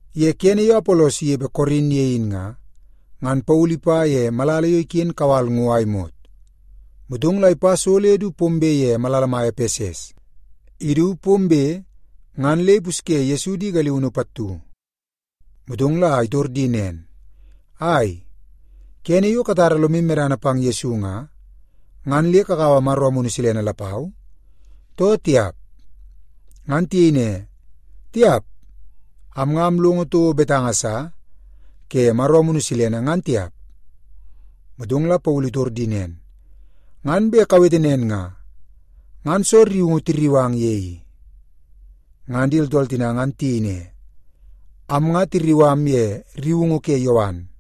Ye kene yo Apolos inepe Korin ye in nga, ngan Paulu ipa ye malala yo iken kawal ngo a imot, motong la ipa so le du pombe ye malala mai Epeses. Idu pombe, ngan le ipusye Yesu di galiunu pattu. Motong la itor di nen, “Ai, kene yo katara lomu medana pang Yesu nga, ngan le kakaua Maro Amunu Silene lapau, too tiap?” Ngan tiyei ne, “Tiap. Am nga amlongo toko betanga sa ke Maro Amunu Silene, ngan tiap.” Motong la Paulu itor di nen, “Ngan bet kawete nen nga, ngan soo rriungu tirriu ang ye i?” Ngan di tooltool tina ngan tiyei ne, “Am nga tirriu am ye rriungu ke Yowan.”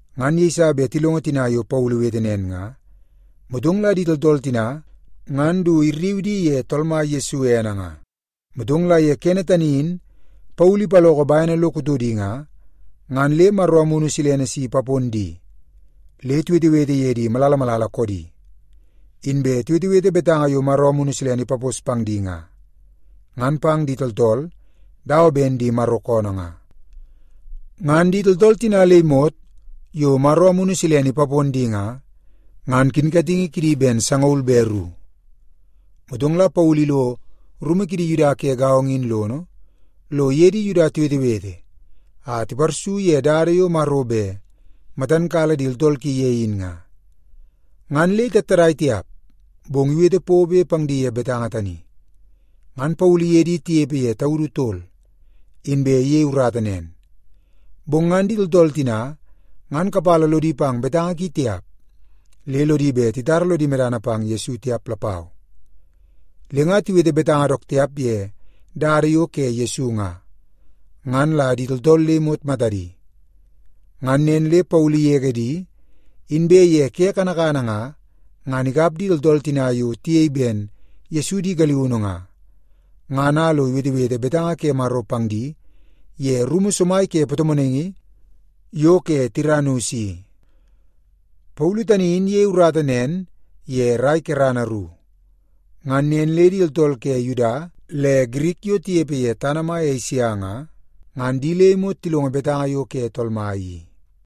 Ngan yeiso bet tilongo tina yo Paulu iwete nen nga, motong la di tooltool tina ngan du irriu di ye Tool Mai Yesu ene nga. Motong la ye kene tani in Paulu ipaloko bene lo kutodi nga, ngan le Maro Amunu Silene si ipapon di le tiwetewete ye di malala malala koodi. Inbe tiwetewete betanga yo Maro Amunu Silene ipapos pang di nga, ngan pang di tooltool dawa ben di Maro koonoo nga. Ngan di tooltool tina le imot yo Maro Amunu Silene ipapon di nga, ngan kinkatingi kidi ben sangaul be ru. Motong la Paulu ilo rumu kidi Yuda ke gaongo in lono, lo iye di Yuda tiwetewete a tiparsu ye dada yo Maro bet matan kala di tooltool ki ye in nga. Ngan le itattadai tiap, bong iwete pobe pang di ye betanga tani. Ngan Paulu iye di tinepe ye taudu tol, inbe iyei urata nen. Bong ngan di tooltool tina ngan kapala lodi pang betanga ki tiap, le lodi bet titara lodi medana pang Yesu tiap lapau. Le nga tiwete betanga dook tiap ye Dada yo ke Yesu nga, ngan la di tooltool le imot matadi. Ngan nen le Paulu igege di, inbe ye ke kanakana nga, ngan ikap di tooltool tina yo tiyei ben Yesu di galiunu nga, ngan a lo iwetewete betanga ke Maro pang di ye rumu somai ke patomonaingi yo ke Tiranus i. Paulu tani in iyei urata nen ye rai kerana ru. Ngan nen le di tooltool ke Yuda le Girik yo tinepe ye tana mai Esia nga, ngan di le imot tilongo betanga yo ke Tool Mai i.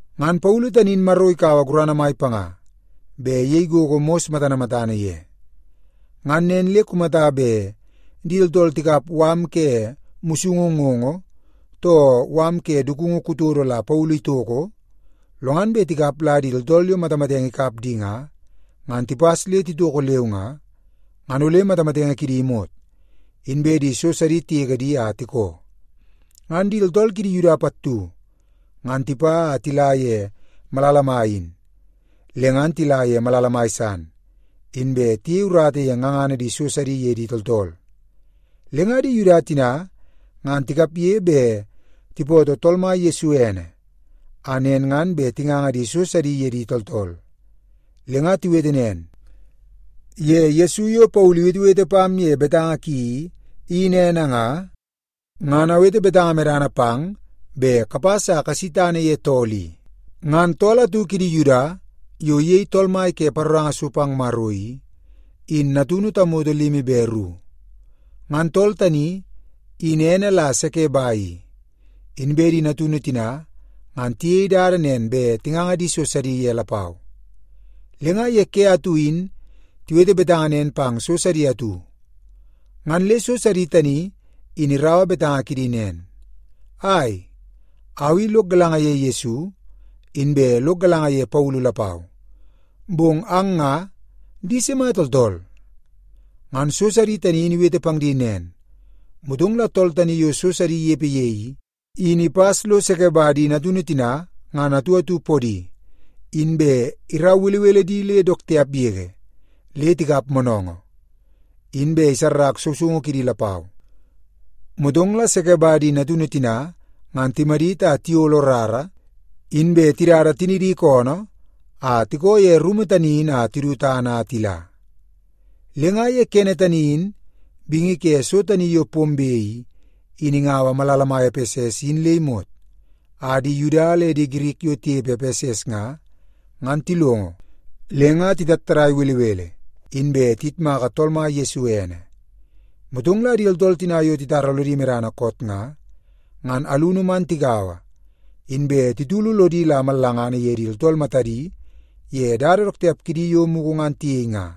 Ngan Paulu tani in Maro ikaua gurana mai panga bet iyei gogo mos matana matana ye. Ngan nen le kumata bet di tooltool tikap mala ke musungu ngoongoo too mala ke dukungu kutodo la Paulu itoko, lo ngan bet tikap la di tooltool yo matamatenge ikap di nga, ngan tipas le titoko leu nga, ngan ole matamatenge kidi imot, inbe di so sidi tigege di a tikoo. Ngan di tooltool kidi Yuda pattu ngan tipa a tila ye malala mai in, le ngan tila ye malala mai san, inbe tiyei urata ye ngangana di so sidi ye di tooltool. Le nga di Yuda tina ngan tikapge bet tipootoo Tool Mai Yesu ene, a nen ngan bet tinganga di so sidi ye di tooltool. Le nga tiwete nen, “Ye Yesu yo Paulu iwetewete pam ye betanga ki i, in ene nga, ngan awete betanga medana pang bet kapas a kasi tana ye tool i.” Ngan tool atu kidi Yuda yo iyei tool mai ke paroranga so pang Maro i, in natunu tamoto limi be ru. Ngan tool tani in ene la Sekeba i, inbe di natunu tina ngan tiyei dada nen bet tinganga di so sidi ye lapau. Le nga ye ke atu in tiwete betanga nen pang so sidi atu, ngan le so sidi tani in iraua betanga kidi nen, “Ai, au i lok galanga ye Yesu, inbe lok galanga ye Paulu lapau. Bong ang nga, di sima tooltool?” Ngan so sidi tani in iwete pang di nen, motong la tool tani yo so sidi inepe ye i, in ipas lo Sekeba di natunu tina ngan atu atu podi, inbe irau belebele di le dook tiap yege le tikap moonoongoo, inbe isarrak sousoungu kidi lapau. Motong la Sekeba di natunu tina ngan timadit a tiyolo rara, inbe tidada tinidi koonoo a tikoo ye rumu tani in a tidu tana a tila. Le nga ye kene tani in bingi ke so tani yo pombe i, in ingaua malala mai Epeses in le imot, a di Yuda le di Girik yo tinepe Epeses nga, ngan tilongo le nga titattadai belebele, inbe tiyitmaka Tool Mai Yesu ene. Motong la di tooltool tina yo titara lodi medana koot nga, ngan alunu man tigaua, inbe titulu lodi la mallangana ye di tooltool matadi ye dada dook tiap kidi yo mugu ngan tiyei nga.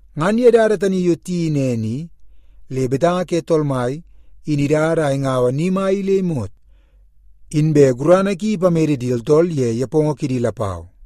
Ngan ye dada tani yo tiyeii nen i, le betanga ke Tool Mai in idada a ingaua ni mai i le imot, inbe gurana ki ipamede di tooltool ye nepongo kidi lapau.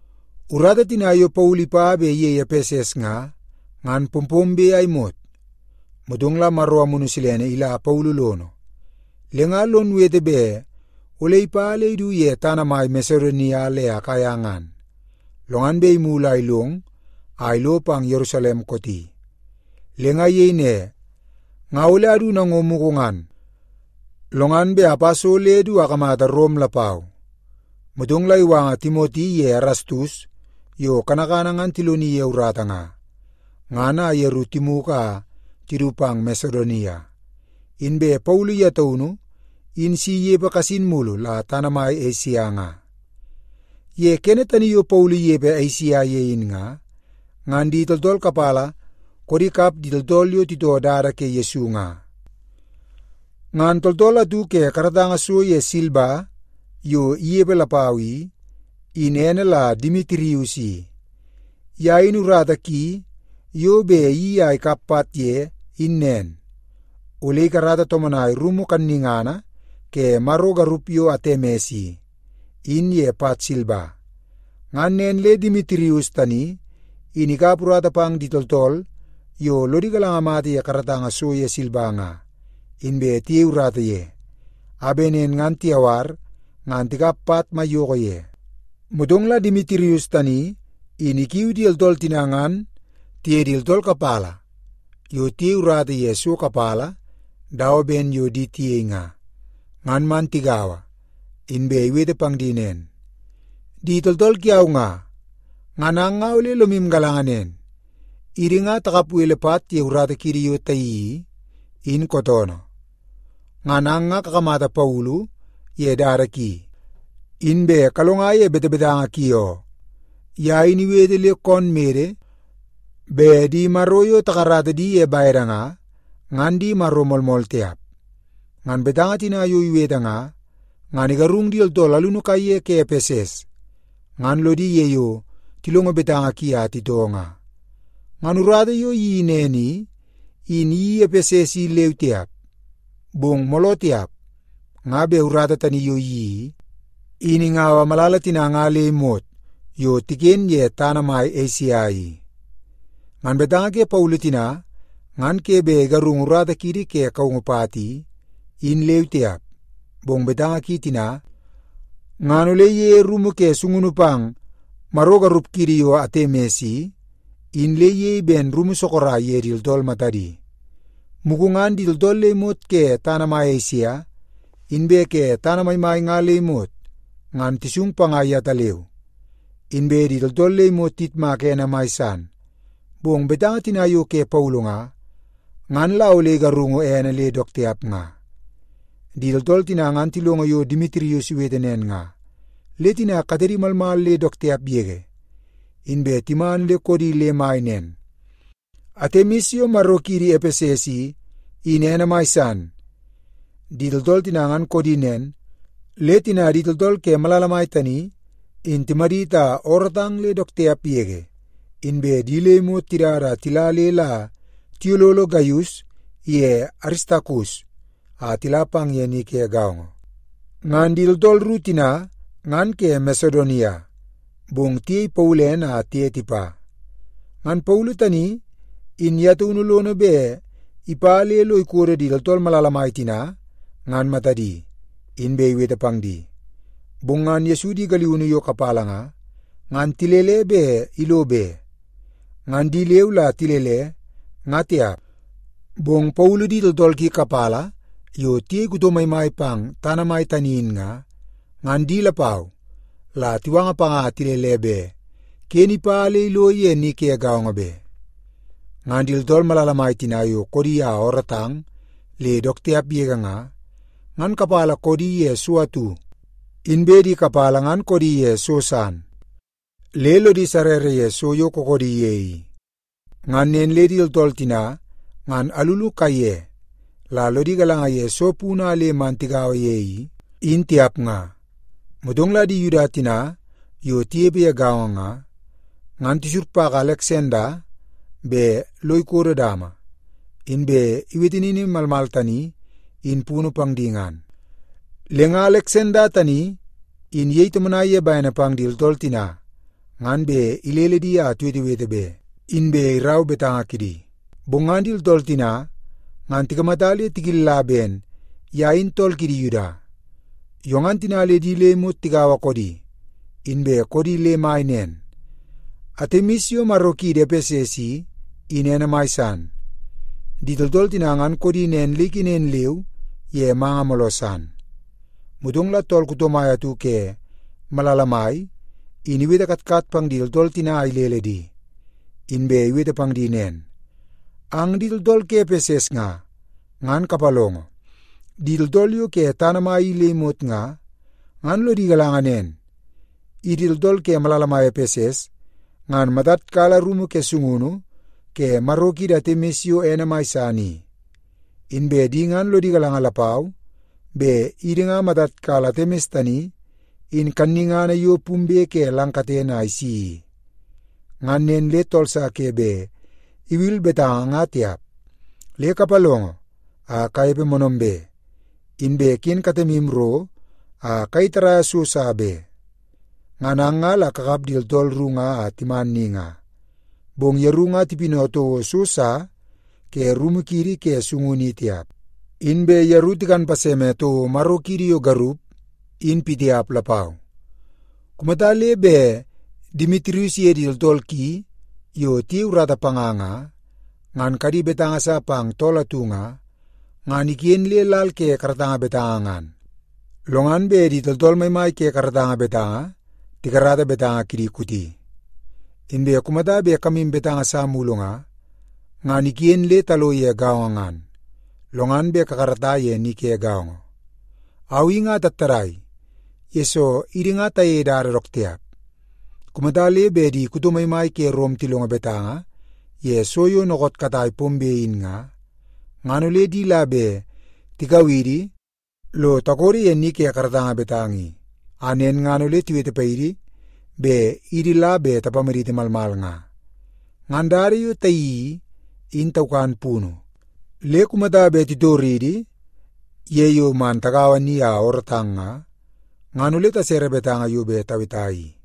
Urata tina yo Paulu ipa bet iyei Epeses nga, ngan pompombe a imot, motong la Maro Amunu Silene ila Paulu lono, le nga lon wete bet ole ipa le idu ye tana mai Masedonia le Akaia ngan, lo ngan bet imulu a ilong a ilo pang Yerusalem kooti. Le nga iyei ne, “Nga ole adu nango mugu ngan, lo ngan bet apa so le du akamata Rom lapau.” Motong la iwanga Timoti iye Erastus yo kanakana ngan tiloni ye urata nga, ngan a yeru timugu a tidu pang Masedonia. Inbe Paulu ye taunu in si inepe kasin mulu la tana mai Esia nga. Ye kene tani yo Paulu inepe Esia ye in nga, ngan di tooltool kapala koodi kap di tooltool yo titoo Dada ke Yesu nga. Ngan tooltool atu ke karatanga so ye silba yo inepe lapau i, in ene la Demitirius i. Ye in urata ki yo bet iyeii a ikap pat ye, in nen; ole ikarata tomonaia rumu kannungana ke maro garup yo ene Atemis i, in ye pat silba. Ngan nen le Demitirius tani in ikap urata pang di tooltool yo lodi galanga mata ye karatanga so ye silba nga, inbe tiyei urata ye, a bet nen ngan tiyawar ngan tikap pat maiyoko ye. Motong la Demitirius tani in ikiui di tooltool tina ngan tiye di tooltool kapala yo tiyei urata ye so kapala dawa ben yo di tiyei nga, ngan man tigaua, inbe iwete pang di nen, “Di tooltool kiau nga, ngan ang nga ole lomu galanga nen, idi nga takap bele pat ye urata kiidi yo tayeii i, in kootoonoo. Ngan ang nga kakamata Paulu ye dada ki, inbe kalonga ye betebetanga ki oo. Ye in iwete le koon mede bet di maro yo takarata di ye bede nga, nga di maro moolmool tiap. Ngan betanga tina yo iwete nga, ngan igarung di tooltool alunu kaiye ke Epeses, ngan lodi ye yo tilongo betanga ki a titoo nga. Ngan urata yo iyeii nen i, in iyeii Epeses i leu tiap, bong mooloo tiap, nga bet urata tani yo iyeii i, in ingaua malala tina nga le imot yo tiken ye tana mai Esia i. Ngan betanga ke Paulu tina ngan ke bet igarungu urata kiidi ke kaungu pat i, in leu tiap, bong betanga ki tina ngan ole iyeie rumu ke sungunu pang maro garup kiidi yo Atemis i, in le iyei ben rumu sorok ye di tooltool matadi. Mugu ngan di tooltool le imot ke tana mai Esia, inbe ke tana maimai nga le imot, ngan tisung panga yetaleu. Inbe di tooltool le imot tiyitmaka ene mai san, bong betanga tina yo ke Paulu nga, ngan la ole igarungu ene le dook tiap nga.” Di tooltool tina ngan tilongo yo Demitirius iwete nen nga, le tina katedi malmal le dook tiap yege, inbe timan le koodi le mai nen, “Atemis yo maro kiidi Epeses i, in ene mai san!” Di tooltool tina ngan koodi nen, le tina di tooltool ke malala mai tani in timadit a oorootang le dook tiap yege, inbe di le imot tidada a tila le la tiyololo Gaius iye Aristakus a tila pang ye ni ke gaongo. Ngan di tooltool ru tina ngan ke Masedonia, bong tiyei Paulu ene a tiye tipa. Ngan Paulu tani in ye taunu lono bet ipa le lo ikodo di tooltool malala mai tina ngan matadi, inbe iwete pang di. Bong ngan Yesu di galiunu yo kapala nga, ngan tilele bet ilo be. Ngan di leu la tilele, nga tiap, bong Paulu di tooltool ki kapala yo tiyei kuto maimai pang tana mai tani in nga, ngan di lapau la tiwanga panga a tilele bet ken ipa le ilo ye ni ke gaongo be. Ngan di tooltool malala mai tina yo koodi a oorootang le dook tiap yege nga, ngan kapala koodi ye so atu, inbe di kapala ngan koodi ye so san, le lodi sarrara ye soo kookoodi ye i. Ngan nen le di tooltool tina ngan alunu kaiye la lodi galanga ye soo punu a le man tigaua ye i, in tiap nga. Motong la di Yuda tina yo tinepe ye gaongo nga, ngan tisurpaka Aleksanda bet lo ikodo dama, inbe iwete nini malmal tani in punu pang di ngan. Le nga Aleksanda tani in iyei tomonai ye bene pang di tooltool tina ngan bet ilele di a tiwetewete be, inbe irau betanga kidi. Bong ngan di tooltool tina ngan tikamata le tikilla ben ye in tool kidi Yuda. Yo ngan tina le di le imot tigaua koodi, inbe koodi le mai nen, “Atemis yo maro kiidi Epeses i, in ene mai san!” Di tooltool tina ngan koodi nen le ikenen leu ye manga mooloo san. Motong la tool kuto mai atu ke malala mai in iwete katkat pang di tooltool tina a ilele di, inbe iwete pang di nen, “Ang di tooltool ke Epeses nga, ngan kapalongo! Di tooltool yo ke tana mai i le imot nga, ngan lodi galanga nen, idi tooltool ke malala mai Epeses ngan matad kala rumu ke sungunu ke maro kiidi Atemis yo ene mai san i. Inbe di ngan lodi galanga lapau bet idi ngan matad kala Atemis tani in kannungana yo pumbe ke lang katene a isi i. Ngan nen le tool sa ke bet iwil betanga nga tiap. Le kapalongo a kanepe moonoombe, inbe ken katemu ro a kayei tarraia so sa be. Ngan ang nga la kakap di tooltool ru a timan ni nga, bong yeru nga tipinau toko so sa ke rumu kiidi ke sungunu i tiap. Inbe yeru tikan paseme toko maro kiidi yo garup in pitiap lapau. Kumata le bet Demitirius iye di tooltool ki yo tiyei urata panga nga, ngan kadi betanga sa pang tool atu nga, ngan iken le lal ke karatanga betanga ngan, lo ngan bet di tooltool maimai ke karatanga betanga tikarata betanga kidi kooti. Inbe kumata bet kamu betanga sa mulu nga, ngan iken le talo ye gaongo ngan, lo ngan bet kakarata ye ni ke gaongo. Au i nga atattadai, yesoo idi nga tayeie dada dook tiap. Kumata le bet di kuto maimai ke Rom tilongo betanga ye so yo dookoot katai pombe in nga, ngan ole di la bet tikau idi lo takodo ye ni ke karatanga betanga i, a nen ngan ole tiwete paidi bet idi la bet tapamaditi malmal nga. Ngan dada yo tayeii i, in taukan punu. Le kumata bet titoridi ye yo man tagaua ni a oorootang nga, ngan ole tasere betanga yo bet taweta i.”